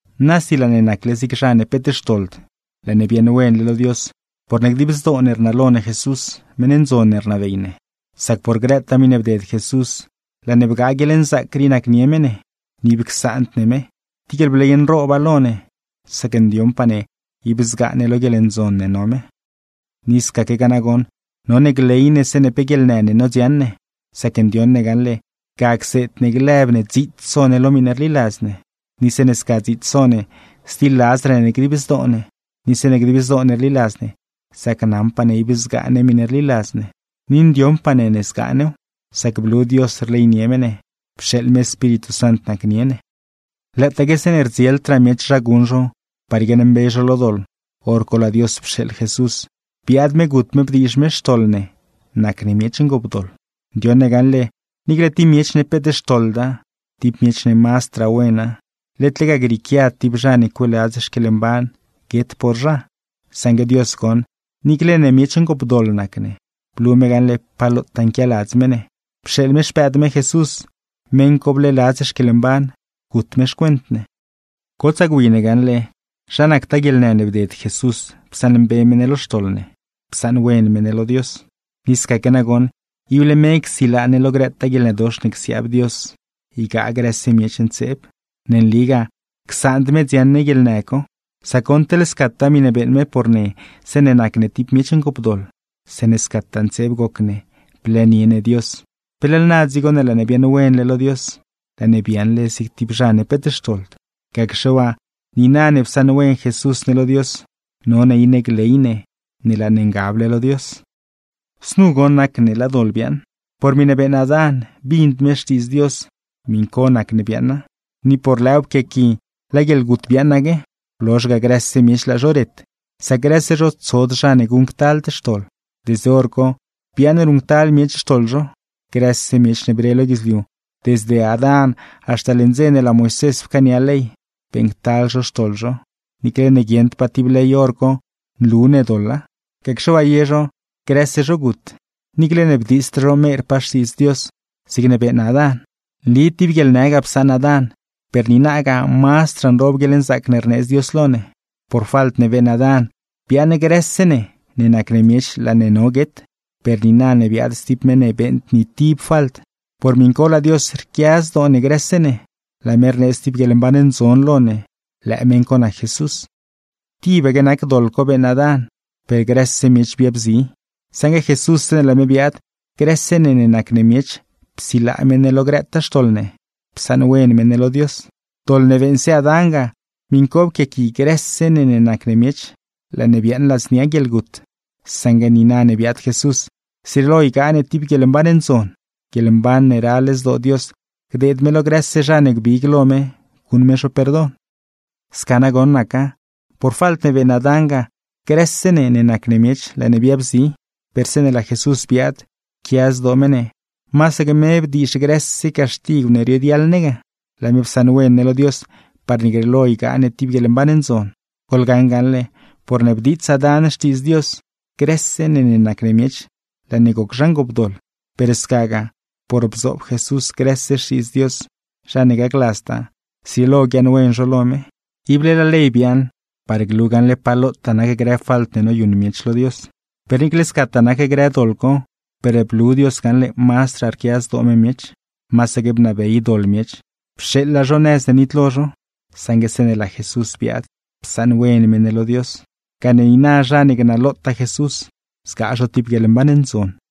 Nasi laa ne nacle zig zha ne peet xtoḻd, laa ne biaaṉwenle lo Dios porne dib zdoo ne rnalo ne Jesús, meṉ ndzon ne rnabey ne. Sac por grëtaa miṉe bded Jesús, laa ne bgaa guieḻnzaac rii nacnie me ne, ni ib csaand ne me. Tib guieḻbley nrooba lo ne, sac ndioṉpaa ne ib zgaa ne lo guieḻndzon ne no me. Ni scaquegaa nagoṉ none gley ne zeeṉe pe guieḻnë ne nodziaṉ ne; sac ndioṉ ne gaṉle, ga cseed ne lëb ne dziits so ne lo miṉe rliladz ne. Ni zeeṉe sca dziits so ne, zliladzraa ne dib zdoo ne; ni zeeṉe dib zdoo ne rliladz ne, zacnaṉpaa ne ib zgaa ne miṉe rliladz ne. Ni ndioṉpaa ne zgaa new, sac blu Dios rleynie me ne, pxeeḻ me Espíritu Sant nacnie ne. Lëëtaaque zeeṉe rdzieldraa miech zha guṉ zho par guiaaṉmbe zho lo doḻ, hor co laa Dios pxeeḻ Jesús, biaad me gut me bdiizh me xtoḻ ne nac ne miech ngoopdoḻ. Ndioṉ ne gaṉle, niicle tib miech ne peet xtoḻda, tib miech ne mazdraa wena, led lega grieequiad tib zha ne cueeladz xquieḻmban guet por zha. Saṉgue Dios goṉ, niicle ne miech ngoopdoḻ nac ne, blu me gaṉle pa lotaa nquialadz me ne, pxeeḻ me Xpëëd me Jesús, meṉ co bleeladz xquieḻmban gut me xcuent ne. Gotsaa gwi ne gaṉle, zha nactaa guieḻnë ne bded Jesús psaṉmbe me ne lo xtoḻ ne, psaṉwen me ne lo Dios; ni scaque nagoṉ, ible me csilaa ne lo grëtaa guieḻnëdox ne csiaab Dios ygaa grë miech ntseeb. Ne nligaa, csaand me dziaṉ ne guieḻnë co; sac goṉ, teḻ scataa miṉe beeṉ me por ne zeeṉe nac ne tib miech ngoopdoḻ, zeeṉe scataa ntseeb goc ne blëënie ne Dios, ¿pe leḻ na dzigo ne laa ne biaaṉwenle lo Dios, laa ne biaaṉle zig tib zha ne peet xtoḻd? Gacxe waa, niina ne psaṉwen Jesús ne lo Dios, none iṉe gley ne ne laa ne ngable lo Dios. Znu goṉ nacne laa doḻ biaaṉ: por miṉe beeṉ Adán bind me xtiidz Dios, miṉ co nac ne biaaṉa. Ni por lëëw pquiaqui laa guieḻgut biaaṉaque, blozh ga grëse miech laa zho ret, sac grëse zho, tsod zha ne guṉctald xtoḻ. Desde hor co biaaṉ ruṉctal miech xtoḻ zho. Grëse miech ne bre lo guidzliu, desde Adán haxta leṉ dze ne laa Moisés pcaania ley, beeṉctal zho xtoḻ zho, niicle ne guieṉdpaa tib ley hor co nlu ne doḻa. Gacxe waa ye zho, grëse zho gut; niicle ne bdiitsd zho merpaa xtiidz Dios zigne beeṉ Adán. Nli tib guieḻnë ga psaṉ Adán, per niinagaa mazdraa nroob guieḻnzaac ne rneedz Dios lo ne. Por falt ne beeṉ Adán, biaaṉ grëse ne ne nac ne miech laa ne no guet; per niina ne biaad stib meṉ ne beeṉd ni tib falt, por miṉ co laa Dios rquia zdoo ne grëse ne, laa me rneedz tib guieḻmban ndzon lo ne; lëë meṉ co nac Jesús. Tibaque nac doḻ co beeṉ Adán, per grëse miech biabzi; saṉgue Jesús zeeṉe laa me biaad, grëse ne ne nac ne miech psilaa me ne lo grëtaa xtoḻ ne, psaṉwen me ne lo Dios. Doḻ ne beeṉse Adán ga, miṉ co pquiaqui grëse ne ne nac ne miech, laa ne biaaṉ ladznia guieḻgut; saṉgue niina ne biaad Jesús, zrieelo ygaa ne tib guieḻmban ndzon. Guieḻmban ne ral zdoo Dios gdeed me lo grëse zha ne gbig lo me guṉ me zho perdon. Sca nagoṉ naca: por falt ne beeṉ Adán ga, grëse ne ne nac ne miech laa ne biabzi, per zeeṉe laa Jesús biaad, pquia zdoo me ne masaque me bdiizh grëse caxtigw ne rioguiaḻ ne ga, laa me psaṉwen ne lo Dios parne grieelo ygaa ne tib guieḻmban ndzon. Goḻgaṉ gaṉle, porne bdiits Adán xtiidz Dios, grëse ne ne nac miech laa ne goc zha ngoopdoḻ; per scagaa, por bzoob Jesús grëse xtiidz Dios, zha ne gacladztaa, zrieelo guiaaṉwen zho lo me. Ible laa ley biaaṉ, par glu gaṉle pa lotaa nac grë falt ne noyuṉ miech lo Dios. Per niicle scataa nac grë doḻ co, per blu Dios gaṉle mazdraa rquia zdoo me miech. Masaque bnabey doḻ miech, pxeeḻa zho nëz ne nitlo zho; saṉgue zeeṉe laa Jesús biaad, psaṉwen me ne lo Dios, gane niina zha ne gnalotaa Jesús zgaa zho tib guieḻmban ndzon.